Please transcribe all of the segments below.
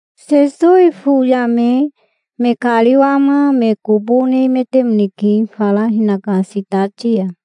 Sesowi tofoyame me kariwama me kobo nemetemoneke fara hinaka sitati ya.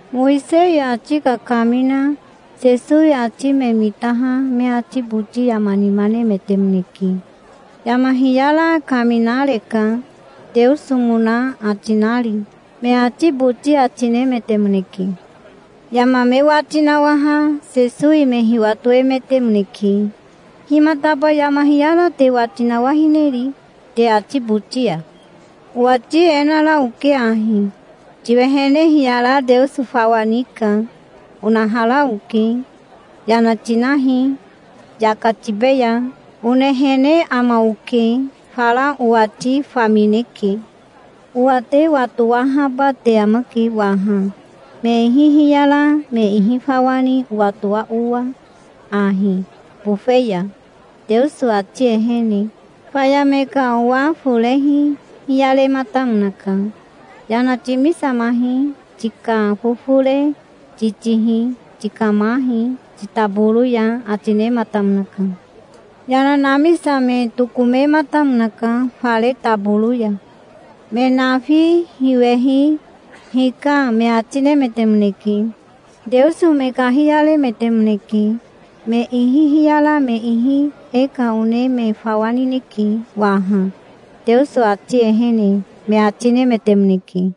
Mowisei ati kakamina Sesowi ati me mitaha me ati boti yama nima nemetemoneke. "Yama hiyara kaminareka, Teosomona ati nari", me ati boti ati nemetemoneke. Yama me wati nawaha Sesowi me hiwatoemetemoneke. "Himataba yama hiyara te wati nawahineri te ati boti ya? Owati e nara oke ahi: 'Tiwehene hiyara Teoso fawa nika', onahara oke. 'Yana tinahi, yaka tibeya', onehene ama oke. Fara owati famineke. Owa te watowahaba te amake waha, me ihi hiyara me ihi fawa ni owatoa owa ahi, bofe ya, Teoso ati ehene". Faya me ka owa forehi hiyarematamonaka. "Yana timisamahi. Tika fofore titihi. Tikamahi titaboro ya", ati nematamonaka. Yana namisame tokomematamonaka fare taboro ya. Me nafi hiwehi "Hika", me ati nemetemoneke. Teoso me kahiyaremetemoneke. "Me ihi hiyara me ihi e ka one me fawa nineke waha, Teoso ati ehene", me ati nemetemoneke.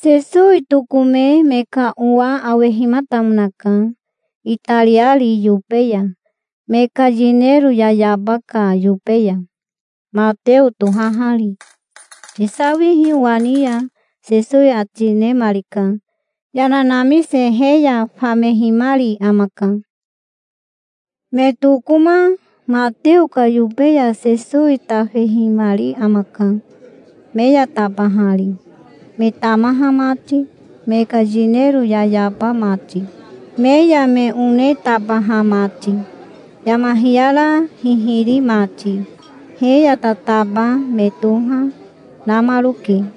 Sesowi tokome me ka owa awehimatamonaka, itariari yobe ya, me ka yinero yayaba ka yobe ya, Mateo tohahari. "Tisawihi owa ni ya", Sesowi ati nemarika. Yana namise he ya famehimari amaka. Me tokoma Mateo ka yobe ya Sesowi tafehimari amaka, me ya tabahari, me tamaha mati, me ka yinero yayaba mati, me ya me one tabaha mati, yama hiyara hihiri mati. He ya tataba me toha, namaroke.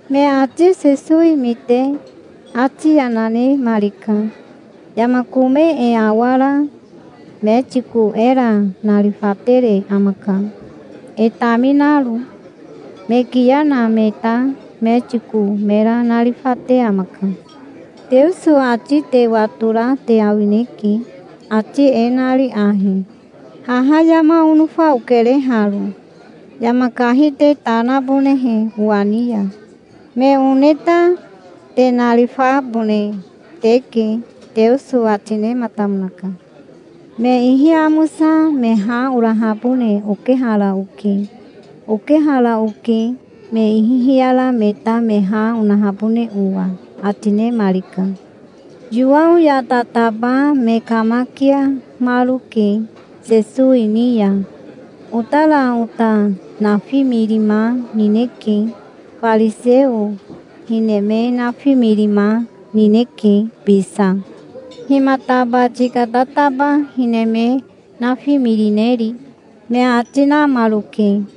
Me ati Sesowi mite ati yana nemarika. "Yama kome e awara metiko era narifatere amaka, e taminaro. Me kiya na me ta metiko mera narifate amaka. Teoso ati te watora te awineke, ati e nari ahi: 'Haha yama onofa okere haro, yama kahi te ta nabonehe owa ni ya. Me one ta te narifabone teke', Teoso ati nematamonaka. Me ihi amosa me ha orahabone okehara oke. Okehara oke, me ihi hiyara me ta me ha onahabone owa", ati nemarika. Yowao ya tataba me kamakiamaroke Sesowi ni ya. "Otara ota nafimirima nineke. Fariseo hine me nafimirima, nineke bisa. Himataba tika tataba hine me nafimirineri?" me ati namaroke.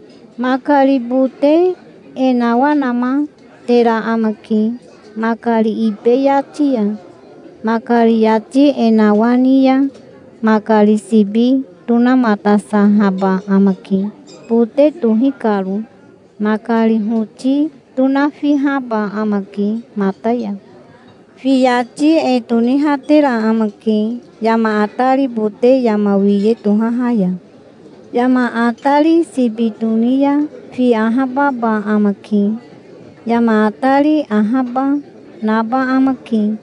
Makari bote e nawanamatera amake makari ibe yati ya. Makari yati e nawani ya makari sibi tonamatasahaba amake, bote tohi karo. Makari hoti tonafihaba amake mata ya. Fi yati e tonihatera amake yama atari bote yama wiye tohaha ya. Yama atari sibi toni ya fi ahababa amake. Yama atari ahaba, naba amake.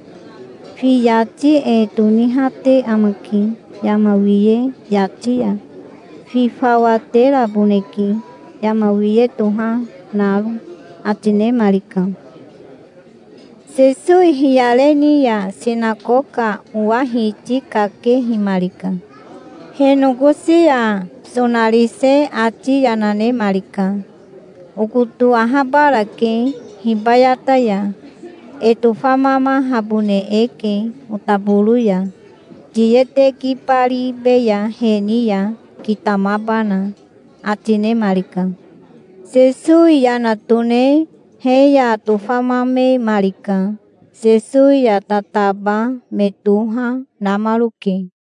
Fi yati e tonihate amake yama wiye yati ya. Fi fawa teraboneke, yama wiye toha naro", ati nemarika. Sesowi hiyare ni ya sinakoka owa hiti kakehimarika. He nokosi ya sonarise ati yana nemarika. "Okoto ahabarake hibayata ya. E tofamamahabone eke otaboro ya. Tiye tekibaribeya he ni ya, kitamabana", ati nemarika. Sesowi yana tone he ya tofamamemarika. Sesowi ya tataba me toha, namaroke.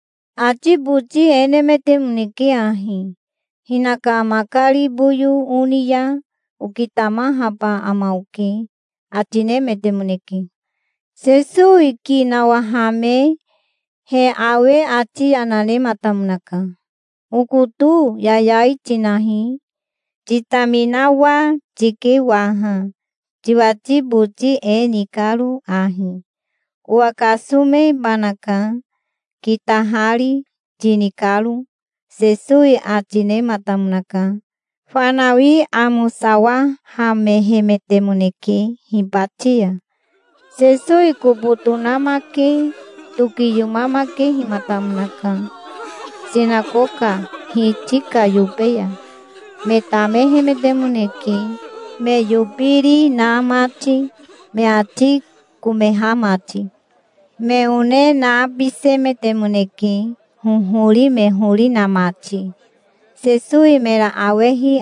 Ati boti e nemetemoneke ahi: "Hinaka makari boyo oni ya okitamahaba ama oke", ati nemetemoneke. Sesowi ki nawahame he awe ati yana nematamonaka. "Okoto yayai tinahi. Titaminawa tike waha, tiwati boti e ni karo ahi, 'Owa kasomebanaka, kitahari', tini karo", Sesowi ati nematamonaka. Fanawi amosawahamehemetemoneke, hibati ya. Sesowi kobo tonamake tokiyomamakehimatamonaka sinakoka hiti ka yobe ya. Me tamehemetemoneke, me yobiri na mati, me ati komeha mati. Me one nabisemetemoneke, hohori me hori na mati. Sesowi mera awehi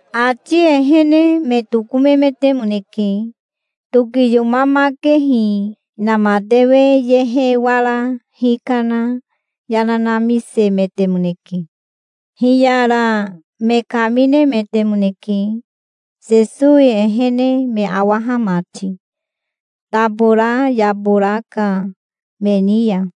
Ati ehene me tokomemetemoneke. Tokiyomamakehi inamatewe yehe wara hikana yana namisemetemoneke. Hiyara me kaminemetemoneke, Sesowi ehene me awaha mati, tabora yabora ka me ni ya.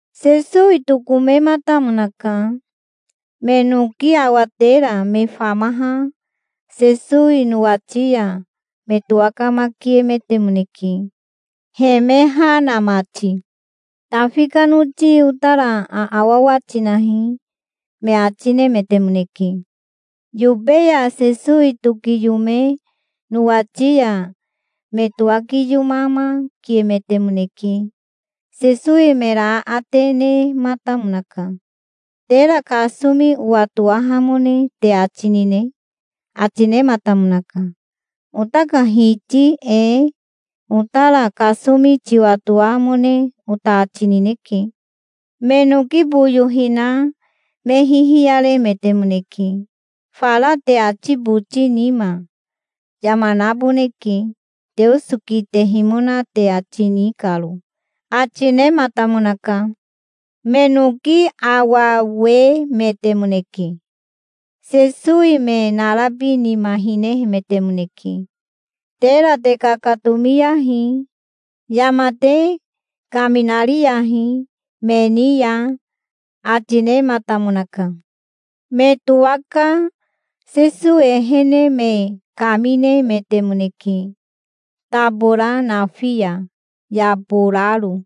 Sesowi tokomematamonaka. Me noki awatera me famaha Sesowi nowati ya me towakamakiemetemoneke, he me ha na mati. "Tafi ka noti otara aawawa tinahi", me ati nemetemoneke. Yobe ya Sesowi tokiyome nowati ya me towakiyomamakiemetemoneke. Sesowi mera aate nematamonaka. "Tera kasomi owatowahamone te ati nine?" ati nematamonaka. "Ota ka Hiti ee, otara kasomi tiwatoamone ota ati nineke". Me noki boyo hina me hihiyarehemetemoneke. "Fara te ati boti nima, yama naboneke, Teoso kitehimona te ati ni karo", ati nematamonaka. Me noki awawemetemoneke. Sesowi me narabi nima hinehemetemoneke. "Tera te kakatomiyahi. Yama te kaminariyahi me ni ya", ati nematamonaka. Me towaka Sesowi ehene me kaminemetemoneke tabora nafi ya, yaboraro.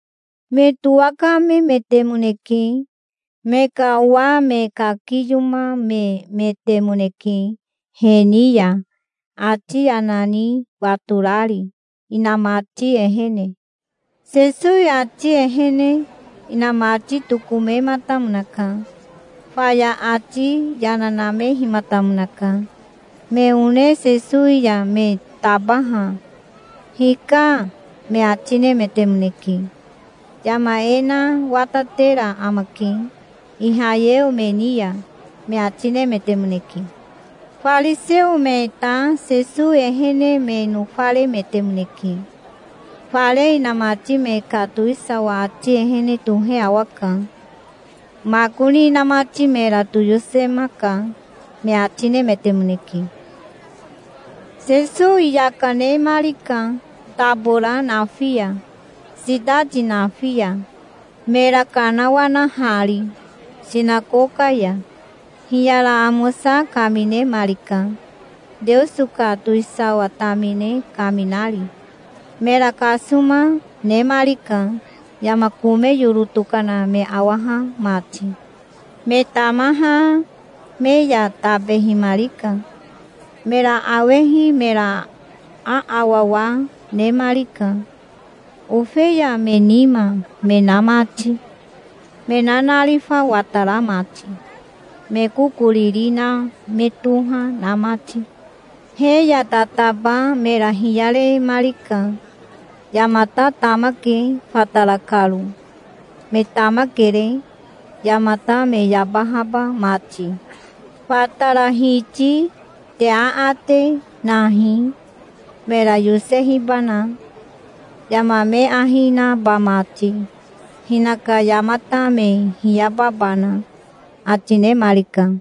Me towakamemetemoneke. Me ka owa me kakiyomamemetemoneke he ni ya, ati yana ni watorari, inamati ehene. Sesowi ati ehene inamati tokomematamonaka. Faya ati yana namehimatamonaka. Me one Sesowi ya me tabaha "Hika", me ati nemetemoneke. "Yama e na watatera amake Ihayeo me ni ya", me ati nemetemoneke. Fariseo me ta Sesowi ehene me nofaremetemoneke. "Fare inamati me ka towisawa ati ehene tohe awaka. Makoni inamati mera toyosemaka", me ati nemetemoneke. Sesowi yaka nemarika tabora nafi ya, sitati nafi ya, mera kanawanahari sinakoka ya. Hiyara amosa kaminemarika, Teoso ka towisawa tamine kaminari. Mera kasoma nemarika, yama kome yoro tokana me awaha mati. Me tamaha me ya tabehimarika. Mera awehi mera aawawa nemarika, ofeya me nima me na mati, me nanarifa watara mati, me kokoriri na me toha na mati. He ya tataba mera hiyaremarika. "Yamata tamake fatara karo. Me tamakere, yamata me yabahaba mati. Fatara Hiti te aate nahi, mera yosehibana, yama me ahi naba mati, hinaka yamata me hiyababana", ati nemarika.